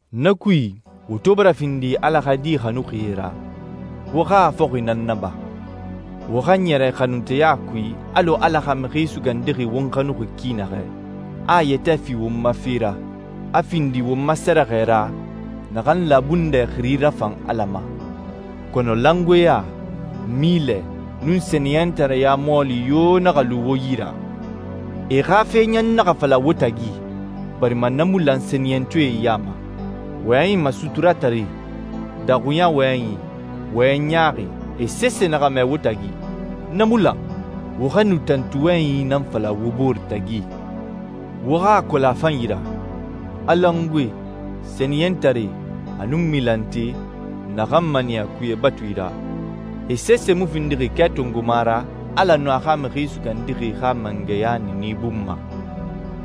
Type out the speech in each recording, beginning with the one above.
Na kui, wo to bara findi Ala xa di xanuxie ra, wo xa a fɔxi nan naba. Wo xa ɲɛrɛ xanunteya kui alɔ Ala xa Mixi Sugandixi won xanuxi ki naxɛ, a a yɛtɛ fi won ma fe ra, a findi won ma sɛrɛxɛ ra naxan labundɛ xiri rafan Ala ma. Kɔnɔ langoeɲa, milɛ, nun sɛniyɛntareɲa mɔɔli yo naxa lu wo yi ra. E xa fe ɲan naxa fala wo tagi, barima na mu lan sɛniyɛntɔɛe ya ma. Wɔyɛnyi masuturatare, daxuɲa wɔyɛnyi, wɔyɛn ɲaaxi, e sese naxa mɛ wo tagi. Na mu lan. Wo xa nu tantu wɔyɛnyi nan fala wo bore tagi. Wo xa a kolon a fanyi ra, a langoe, sɛniyɛntare, a nun milante (naxan maniya kuye batui ra), e sese mu findixi kɛ tongoma ra Ala nun a xa Mixi Sugandixi xa mangɛya niini bun ma.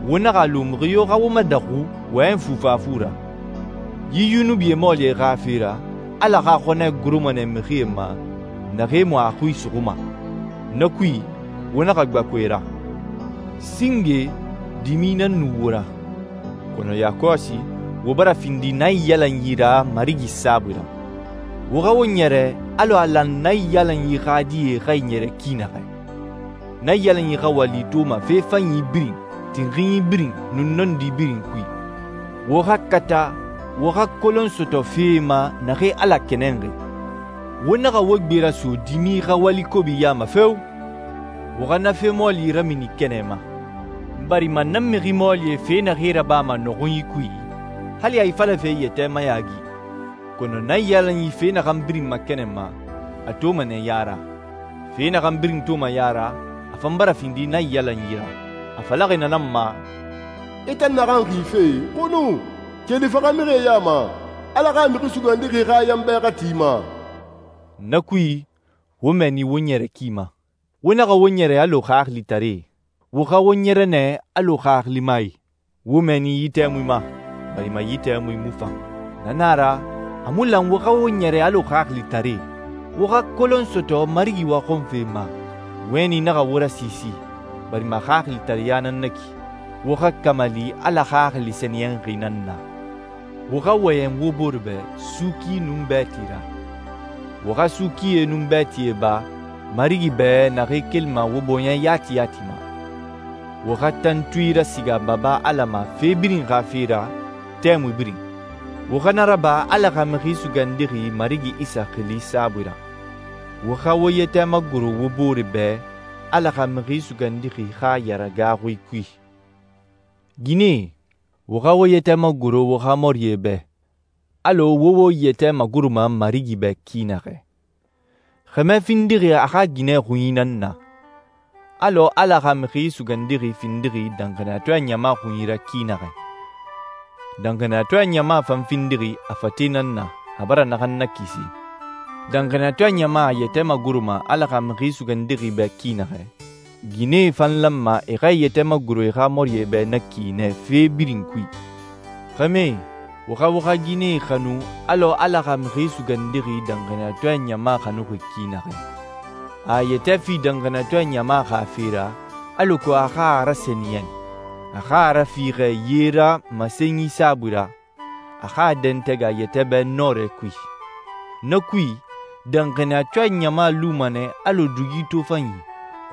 Wo naxa a lu mixi yo xa wo madaxu wɔyɛnyi fufafu ra. Yi yunubi mɔɔlie xa fe ra, Ala xa xɔnɛ goroma nɛ mixie ma naxee mu a xui suxuma. Na kui, wo naxa gbaku e ra. Singe, dimi nan nu wo ra, kɔnɔ yakɔsi, wo bara findi naiyalanyi ra Marigi saabui ra. Wo xa wo ɲɛrɛ alɔ a lan naiyalanyi xa die xa e ɲɛrɛ ki naxɛ. Naiyalanyi xa wali toma fe fanyi birin, tinxinyi birin, nun nɔndi birin kui. Wo xa kata wo xa kolon sɔtɔ fee ma naxee Ala kɛnɛnxi. Wo naxa wo gbe raso dimi xa wali kobi ya ma feo! Wo xa na fe mɔɔli ramini kɛnɛ ma. Barima na mixi mɔɔlie fe naxee rabama nɔxunyi kui, hali a ifalafe yɛtɛ mayaagi. Kɔnɔ naiyalanyi fe naxan birin makɛnɛnma, a toma nɛ ya ra. Fe naxan birin toma ya ra, a fan bara findi naiyalanyi ra. A falaxi na nan ma, «I tan naxan xife, xunu. Keli faxamixie ya ma, Ala xa Mixi Sugandixi xa yanbɛ xa ti i ma.» Na kui, wo mɛɛni wo ɲɛrɛ ki ma. Wo naxa wo ɲɛrɛ alɔ xaxilitaree. Wo xa wo ɲɛrɛ nɛ alɔ xaxilimae. Wo mɛɛni yi tɛmui ma, barima yi tɛmui mu fan. Na na a ra, a mu lan wo xa wo ɲɛrɛ alɔ xaxilitare. Wo xa kolon sɔtɔ Marigi waxɔnfe ma. Wɛni naxa wo rasiisi, barima xaxilitareɲa nan na ki. Wo xa kamali Ala Xaxili Sɛniyɛnxi nan na. Wo xa wɔyɛn wo bore bɛ suuki nun bɛɛti ra. Wo xa suukie nun bɛɛtie ba Marigi bɛ naxee kelima wo bɔɲɛ yati yati ma. Wo xa tantui rasiga Baba Ala ma fe birin xa fe ra, tɛmui birin. Wo xa na raba Ala xa Mixi Sugandixi Marigi Isa xili saabui ra. Wo xa wo yɛtɛ magoro wo bore bɛ Ala xa Mixi Sugandixi xa yaragaaxui kui. Ginɛe, wo xa wo yɛtɛ magoro wo xa mɔrie bɛ, alɔ wo wo yɛtɛ magoroma Marigi bɛ ki naxɛ. Xɛmɛ findixi a xa ginɛ xunyi nan na, alɔ Ala xa Mixi Sugandixi findixi danxaniyatɔɛ ɲama xunyi ra ki naxɛ. Danxaniyatɔɛ ɲama fan findixi a fate nan na, a bara naxan nakisi. Danxaniyatɔɛ ɲama a yɛtɛ magoroma Ala xa Mixi Sugandixi bɛ ki naxɛ, ginɛe fan lanma e xa e yɛtɛ magoro e xa mɔrie bɛ na ki nɛ fe birin kui. Xɛmɛe, wo xa wo xa ginɛe xanu alɔ Ala xa Mixi Sugandixi danxaniyatɔɛ ɲama xanuxi ki naxɛ. A a yɛtɛ fi danxaniyatɔɛ ɲama xa fe ra alako a xa a rasɛniyɛn, a xa a rafiixɛ ye ra masenyi saabui ra, a xa a dɛntɛgɛ a yɛtɛ bɛ nɔrɛ kui. Na kui, danxaniyatɔɛ ɲama luma nɛ alɔ dugi tofanyi,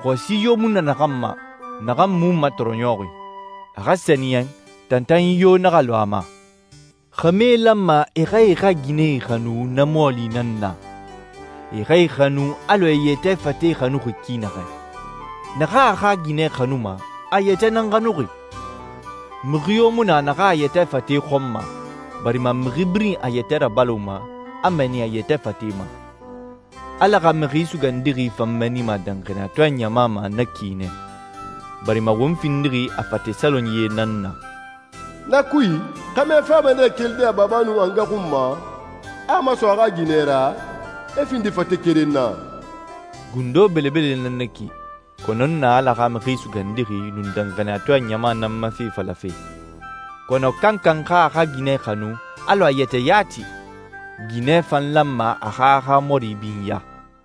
xɔsi yo mu na naxan ma, naxan mu matɔrɔɲɔxi. A xa sɛniyɛn, tantanyi yo naxa lu a ma. Xɛmɛe lanma e xa e xa ginɛe xanu na mɔɔli nan na. E xa e xanu alɔ e e yɛtɛ fate xanuxi ki naxɛ. Naxan a xa ginɛ xanuma, a a yɛtɛ nan xanuxi. Mixi yo mu na naxan a yɛtɛ fate xɔnma, barima mixi birin a yɛtɛ rabaloma, a mɛɛni a yɛtɛ fate ma. Ala xa Mixi Sugandixi fan mɛɛnima danxaniyatɔɛ ɲama ma na ki nɛ, barima won findixi a fate salonyie nan na. «Na kui, xɛmɛ fama nɛ kelide a baba nun a nga xun ma, a a maso a xa ginɛ ra, e findi fate keren na.» Gundo belebele nan na ki, kɔnɔ n na Ala xa Mixi Sugandixi nun danxaniyatɔɛ ɲama nan ma fe falafe. Kɔnɔ kankan xa a xa ginɛ xanu alɔ a yɛtɛ yati. Ginɛ fan lanma a xa a xa mɔri binya.